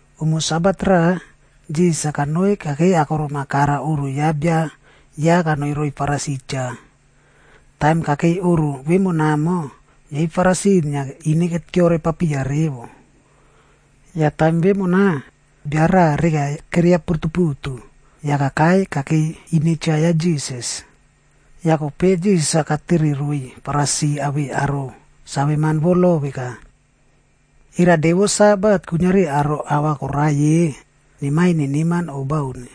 Umo Sabat raꞌa, Jisas-a kanoi kakei akorom-a kara oꞌro ya bia ya kanoi roiy Farisi cha. Taim kakei oꞌro vemonamo, yei Farisi inia ine keore papiya revo. Yah taim vemona, bia raꞌa reka keria putuputu, yah kakai kakei ine cha ya Jisas. Yah kope Jisas-a katere roiy Farisi awei aro saveman vo lo veka, “Era de vo Sabat kuiniari aro ahva koraiy-e, nemaiy neneman o bauni?”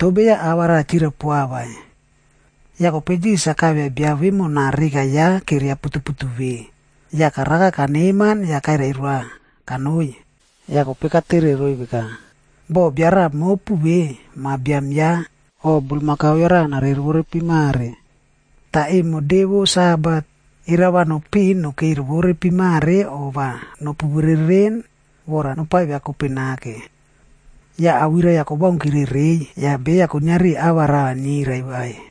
Toh beya ava raꞌa chirai poa vai. Yah kope Jisas-a kaivia bia vemona reka ya keria putuputu ve, yah karaka kaneman yah kairai roa kanoi. Yah kope katere roiy veka, “Boh raꞌa mopu ve, ma biam ya, o bulmakau ya raꞌa narei rovore pimare, tah emo de vo Sabat, era va nopiꞌin nakei rovore pimare o va nopu bereren vora nopaviakope nake?” Yah awirai-a kobaunkire reiy, yah beya kuiniari ava raꞌa nirai vai.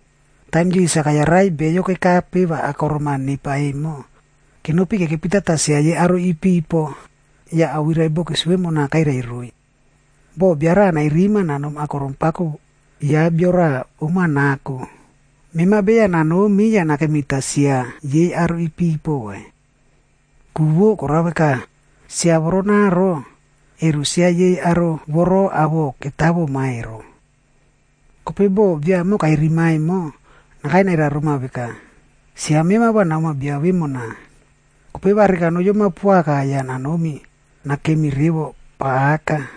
Taim Jisas-a kayarai beyo kekape va akorom-a nepa emo, kenopi kekepitata sia yei aro ipipo, yah awirai bokis vemona kairai roiy. “Boh bia raꞌa nairima nanom akorom pako ya bia raꞌa om-a nako, mema beya nanomi yah nakemita sia yei aro ipipo vai. Ku vo korao veka, sia voronaro, ero sia yei aro voro awoꞌo ketawoma ero. Kope boh biaemo kairima emo, nakai nairai roma veka, ‘Sia mema va namoa bia vemona.’ Kope va reka va noyoma poaka yah nanomi nakemi revo pa aka.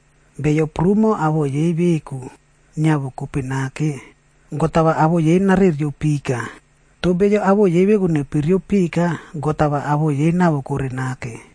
Beyo prumo awoꞌo yei veku niavokope nake, God va awoꞌo yei narereo pika. Toh beyo awoꞌo yei veku nepereope pika, God-a va awoꞌo yei nawokore nake.”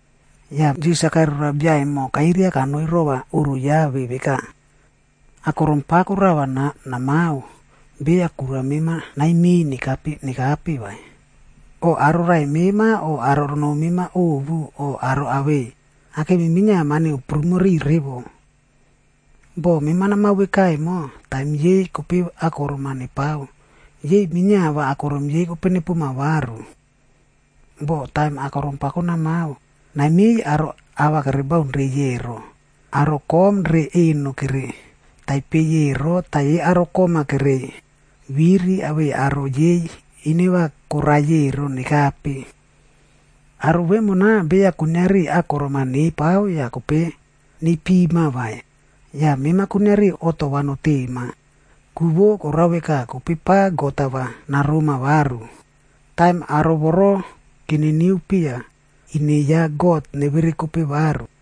Yah Jisas-a kairai roa bia emo kairia kanoi rova oꞌro ya ve veka, “Akorom pako rava namao, beya kura mema naimiꞌiy nekape vai, o aro raꞌai mema o aro noo mema ovu o aro awei kakemi minia mani koprumo riꞌiy revo. Boh mema namao veka emo, taim yei kope akorom-a nepao, yei minia va akorom yei kope nepoma varu. Boh taim akorom pako namao, naimiꞌiy aro ava kobaunrei ero, aro kom re eno kere taipeiy ero tah yei aro kom-a kereiy viri awei aro yei ine va koraiy ero nekape. Aro vemona beya kuiniari akorom-a nepao yah kope neipima vai. Yah mema kuiniari oꞌto va notema, ku vo koraka kope pa God-a va naroma varu, taim aro voro keniniu piya ine ya God neverekope varu.”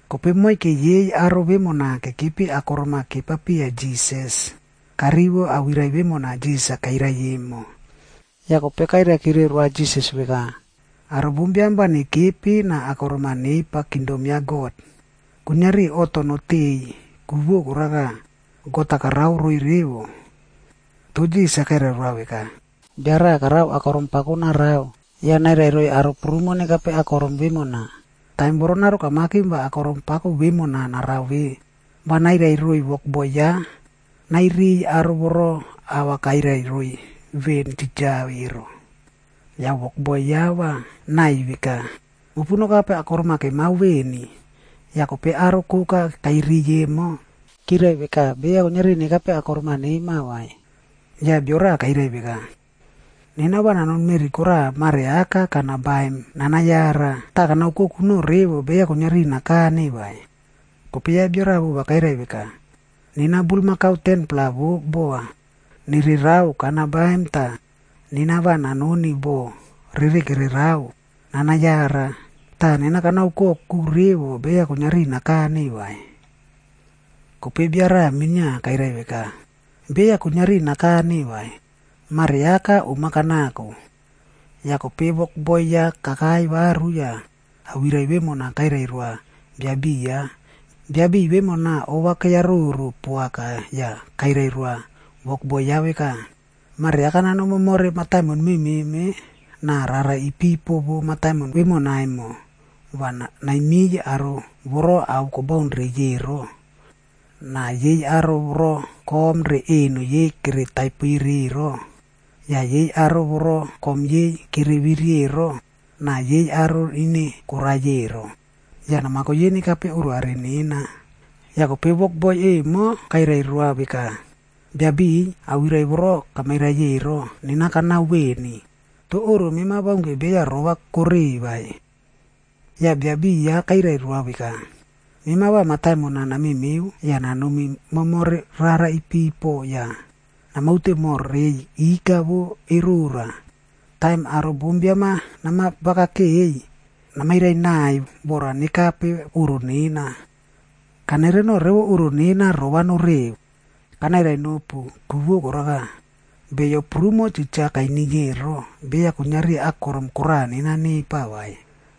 Kope moike yei aro vemona kekepi akorom-a kepa piya Jisas, karivo awirai vemona Jisas-a kairai emo, yah kope kairai kire roa Jisas veka, “Aro bombiam va nekepi na akorom-a nepa kingdom ya God, kuiniari oꞌto noteꞌeiy, ku vo koraka, God-a karao roiy revo.” Toh Jisas-a kairai roa veka, “Bia raꞌa karao akorom pako narao, yah nairai roiy aro prumo nekape akorom vemona. Taim voronaro kamakim va akorom pako vemona narao ve, va nairai roa wokboi ya nairiy aro voro ava kairai roiy veꞌen titja ero. Yah wokboi ya va naꞌai veka, ‘Mopu nokape akorom-a kemao veni.’ “Yah kope aro koka kairiy emo, kirai veka beya kuiniari nekape akorom-a nema vai. Yah bio raꞌa kairai veka, ‘Nena va nanoni meꞌri koraꞌa mare aka kana baim nanayara. Tah kana oukoku noꞌo revo beya kuiniari nakane vai.’ “Kope ya bia raꞌa vova kairai veka, ‘Nena bulmakau 10-pla vo bova nererao kana baim tah nena va nanoni boꞌo rere kererao nana yara. Tah nena kana oukoku revo beya kuiniari nakane vai.’ “Kope bia raꞌa minia kairai veka, ‘Beya kuiniari nakane vai, mareaka oma kanako.’ “Yah kope wokboi ya kakai varu yah awirai vemona kairai roa biabiꞌiy ya. Biabiꞌiy vemona ova keyaroro poaka yah kairai roa wokboi ya veka, ‘Mareaka nanom momore rara mememe na rara ipipo vo mataimon vemona emo yah naimiy aro voro ao kobaun reiy ero, na yei aro voro kom re eno yei kere taipere ero, yah yei aro voro kom yei kere viri ero na yei aro ine koraiy ero. Yah namako yei nekape oꞌro are nena.’ “Yah kope wokboi emo kairai roa veka, ‘Biabiꞌiy, awirai voro kamairai ero, nena kanao veni, toh oꞌro mema baunke beya rova kore vai.’ “Yah biabiꞌiy ya kairai roa veka, ‘Mema va mataimon-a namemeo yah nanomi momore rara ipipo yah namaute moh reiy ika vo erora. Taim aro bombiam-a nama vakakeꞌeiy, namairai naꞌai vora nekape oꞌro nena. Kanereno revo oꞌro nena rova noreo. Kanairai nopu, ku vo koraka, beyo prumo titja kainiy ero, beya kuiniari akorom koraꞌa nena nepa vai.’”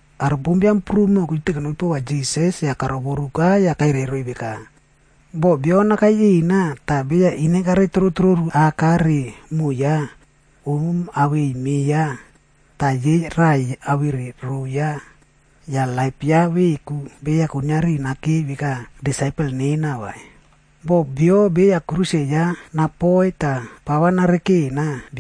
Aro bombiam prumo kiute kenopi pova Jisas yah karovoruka yah kairai roiy veka, “Boh bio nakai rina, tah beya ine kare trotroru aka re moꞌo ya, om awei me ya, tah yei raꞌai awere rou ya, yah laip ya veku, beya kuiniari nakei veka disaipel nena vai. Boh bio beya kruse ya napoiy tah pava narekena,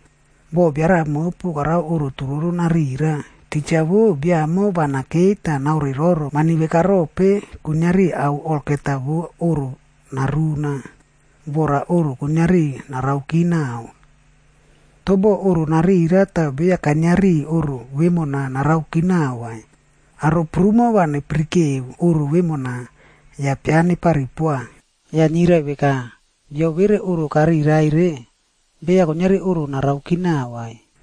“Boh bia raꞌa mopu karao oꞌro turoro raꞌa narira. Titja vo, bia emo va nakei tah naoreroro mani veka rope kuiniari ao olgeta vo oꞌro naruna, vora oꞌro kuiniari naraoki naꞌao. Toh boh oꞌro narira tah beya kainiari oꞌro vemona naraoki naꞌao vai, aro prumo va nepirikeo oꞌro vemona, yah pia nepari poa. Yah nirai veka, ‘Bio vere oꞌro karira ere, beya kainiari oꞌro naraoki naꞌao vai.’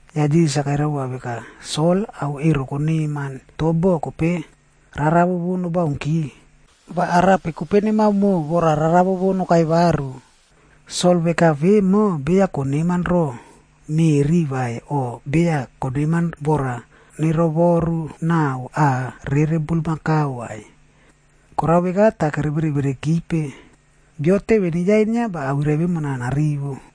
Yah Jisas-a kairai vova veka, “Sol, ao ero koneman, toh boh kope rarawo vo nobaunki, va arape kope nemaomo vora rarawo vo nokai varu? Sol veka vemo beya koneman ro meꞌri vai o beya koneman vora nerovoru naꞌao aꞌa rere bulmakau vai, korao veka tah kevere verekipe. Bio teve neyainia va awirai vemona narivo.”